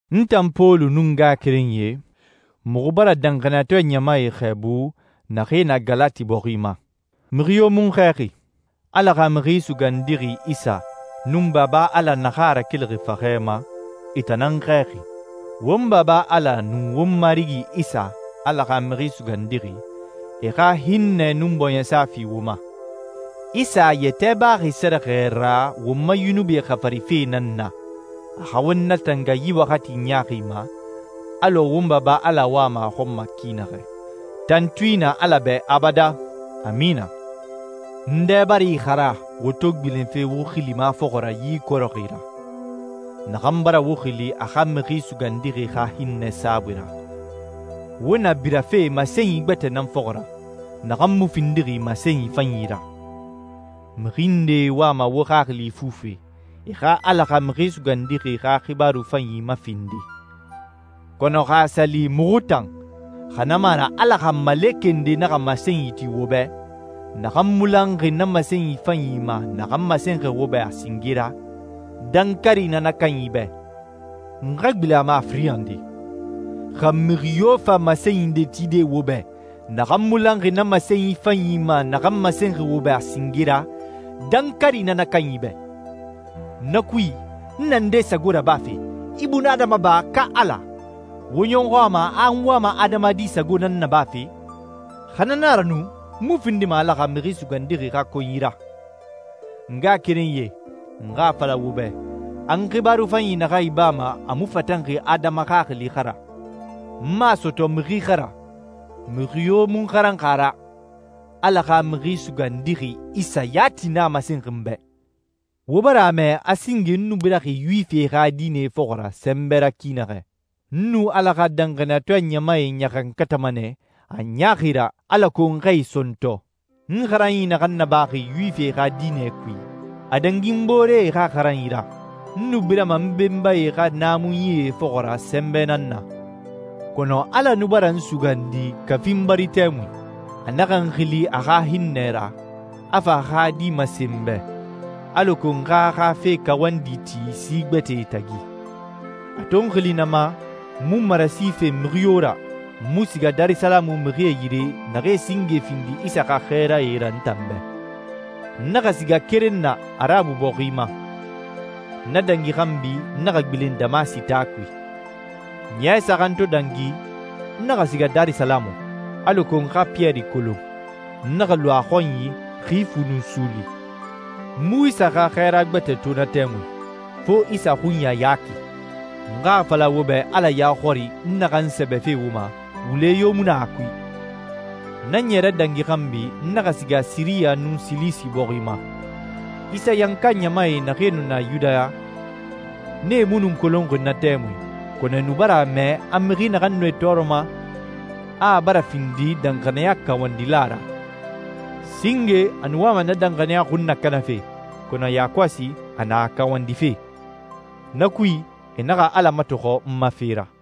N tan Pɔlu nun n ngaxakerenyie, muxu bara danxaniyatɔɛ ɲamae xɛɛbu naxee na Galati bɔxi ma. Mixi yo mu n xɛɛxi. Ala xa Mixi Sugandixi Isa nun Baba Ala naxan a rakelixi faxɛ ma, e tan nan n xɛɛxi. Won Baba Ala nun won Marigi Isa, Ala xa Mixi Sugandixi, e xa hinnɛ nun bɔɲɛsa fi wo ma. Isa a yɛtɛ baxi sɛrɛxɛ ra won ma yunubie xafarife nan na, a xa won natanga yi waxati ɲaaxi ma, alɔ won Baba Ala wama a xɔn ma ki naxɛ. Tantui na Ala bɛ abadan. Amina. N dɛ bara ixara wo to gbilenfe wo xilima fɔxɔ ra yi ikɔrɛxi ra, naxan bara wo xili a xa Mixi Sugandixi xa hinnɛ saabui ra. Wo na birafe masenyi gbɛtɛ nan fɔxɔ ra, naxan mu findixi masenyi fanyi ra. Mixi ndee wama wo xaxili ifufe, e xa Ala xa Mixi Sugandixi xa xibaaru fanyi mafindi. Kɔnɔ xa a sa li muxu tan, xa na mu a ra Ala xa malekɛ nde naxa masenyi ti wo bɛ, naxan mu lanxi na masenyi fanyi ma naxan masenxi wo bɛ a singe ra, dankari na na kanyi bɛ. N xa gbilen na ma a firin nde. Xa mixi yo fa masenyi nde tide wo bɛ, naxan mu lanxi na masenyi fanyi ma naxan masenxi wo bɛ a singe ra, dankari na na kanyi bɛ. Na kui, n na nde sago rabafe, ibunadama ba ka Ala? Wo ɲɔxɔ a ma a n wama adamadi sago nan nabafe? Xa na na a ra nu, n mu findima Ala xa Mixi Sugandixi xa konyi ra. N ngaxakerenyie, n xa a fala wo bɛ a n xibaaru fanyi naxan ibama a mu fatanxi adama xaxili xa ra. N mu a sɔtɔ mixi xa ra. Mixi yo mu n xaranxi a ra. Ala xa Mixi Sugandixi Isa yati nan a masenxi n bɛ. Wo bara a mɛ a singe n nu biraxi Yuwifie xa diinɛ fɔxɔ ra sɛnbɛ ra ki naxɛ. N nu Ala xa danxaniyatɔɛ ɲamae ɲaxankatama nɛ a ɲaaxi ra alako n xa e sɔntɔ. N xaranyi naxan nabaxi Yuwifie xa diinɛ kui, a dangi n booree xa xaranyi ra. N nu birama n benbae xa naamunyie fɔxɔ ra sɛnbɛ nan na. Kɔnɔ Ala nu bara n sugandi kafi n bari tɛmui. A naxa n xili a xa hinnɛ ra, a fa a xa Di masen n bɛ, alako n xa a xa fe kawandi ti si gbɛtɛe tagi. A to n xili na ma, n mu marasi fen mixi yo ra, n mu siga Darisalamu mixie yire naxee singe findi Isa xa xɛɛrae ra n tan bɛ. N naxa siga keren na Arabu bɔxi ma. Na dangi xanbi n naxa gbilen Damasi taa kui. Ɲɛ saxan to dangi, n naxa siga Darisalamu, alako n xa Piyɛri kolon. N naxa lu a xɔnyi xi fu nun suuli. N mu Isa xa xɛɛra gbɛtɛ to na tɛmui, fo Isa xunya Yaki. N xa a fala wo bɛ Ala ya xɔri, n naxan sɛbɛfe wo ma, wule yo mu na a kui. Na ɲɛrɛ dangi xanbi, n naxa siga Siriya nun Silisi bɔxi ma. Isayanka ɲamae naxee nu na Yudaya, nee mu nu n kolonxi na tɛmui, kɔnɔ e nu bara a mɛ a mixi naxan nu e tɔɔrɔma, a a bara findi danxaniya kawandila ra. «Singe a nu wama na danxaniya xun nakanafe, kɔnɔ yakɔsi a na a kawandife.» Na kui, e naxa Ala matɔxɔ n ma fe ra.